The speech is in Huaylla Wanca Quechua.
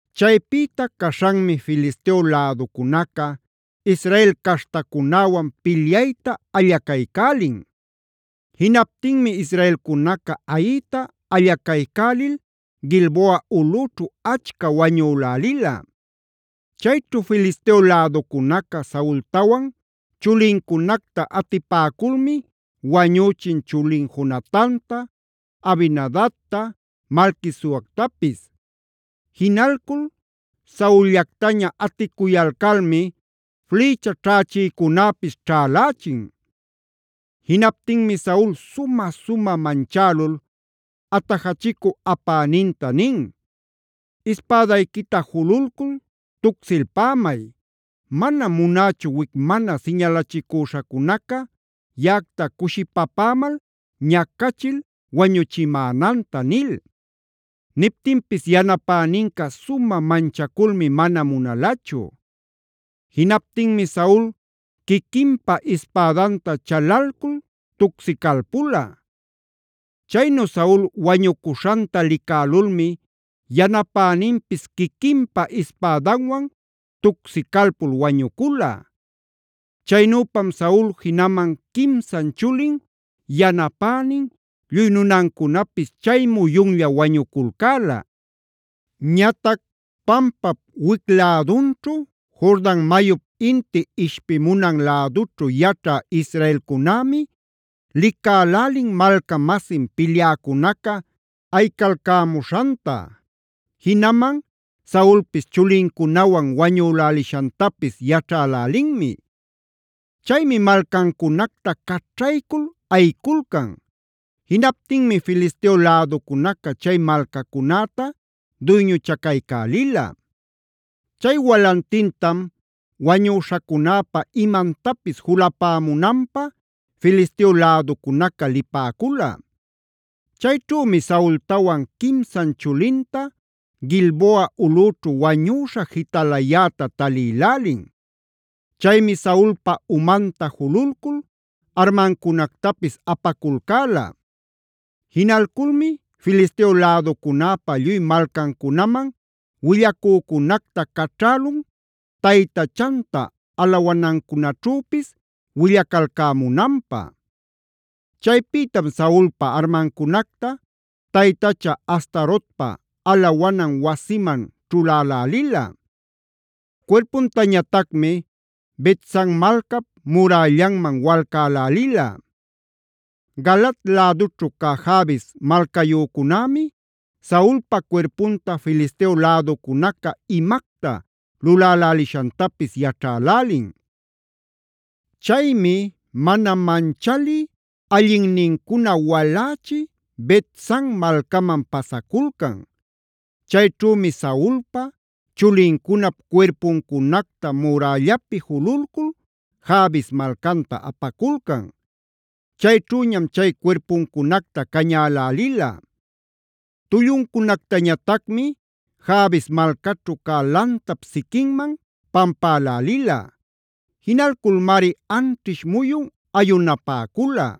Chaypïta caśhanmi Filisteo läducunaca Israel caśhtacunäwan pilyayta allacaycälin. Jinaptinmi israelcunaca ayïta allacaycälil Gilboa ulꞌüćhu achca wañülälila. Chayćhu Filisteo läducunaca Saultawan chulincunacta atipäculmi wañüchin chulin Jonatanta, Abinadabta, Malquisuactapis. Jinalcul Saul-llactaña aticuyalcalmi flïcha ćhächïcunäpis ćhälächin. Jinaptinmi Saul sumä-sumä manchälul, atajachicu apäninta nin: “Ispädayquita jululcul tucsilpämay. Manam munächu wic mana siñalachicüśhacunaca yaꞌacta cushipapämal, ñacachil, wañuchimänanta” nil. Niptinpis yanapäninca sumä manchaculmi mana munalachu. Jinaptinmi Saul quiquinpa ispädanta chalalcul tucsicalpula. Chaynu Saul wañucuśhanta licälulmi yanapäninpis quiquinpa ispädanwan tucsicalpul wañucula. Chaynüpam Saul jinaman quimsan chulin, yanapänin, lluy nunancunapis chay muyunlla wañuculcäla. Ñatac pampap wic-lädunćhu, Jordan mayup inti ishpimunan lädućhu yaćha israelcunämi licälälin malca-masin pilyäcunaca ayicalcämuśhanta; jinaman Saulpis chulincunawan wañülälishantapis yaćhälälinmi. Chaymi malcancunacta caćhaycul ayiculcan. Jinaptinmi Filisteo läducunaca chay malcacunäta duyñuchacaycälila. Chay walantintam wañüśhacunäpa imantapis julapämunanpä Filisteo läducunaca lipäcula. Chayćhümi Saultawan quimsan chulinta Gilboa ulꞌućhu wañüśha jitalayäta talïlälin. Chaymi Saulpa umanta jululcul armancunactapis apaculcäla. Jinalculmi Filisteo läducunäpa lluy malcancunaman willacücunacta caćhälun taytachanta alawanancunäćhüpis willacalcämunanpä. Chaypïtam Saulpa armancunacta taytacha Astarotpa alawanan wasiman ćhulälälila. Cuirpuntañatacmi Bet-san malcap murällanman walcälälila. Galaad lädućhu cä Jabes malcayücunämi Saulpa cuirpunta Filisteo läducunaca imacta lulälälishantapis yaćhälälin. Chaymi mana manchalï allinnincuna walächi Bet-san malcaman pasaculcan. Chayćhümi Saulpa, chulincunap cuirpuncunacta murällapi jululcul Jabes malcanta apaculcan. Chayćhüñam chay cuirpuncunacta cañälälila. Tulluncunactañatacmi Jabes malcaćhu cä lantap siquinman pampälälila. Jinalculmari anćhish muyun ayunapäcula.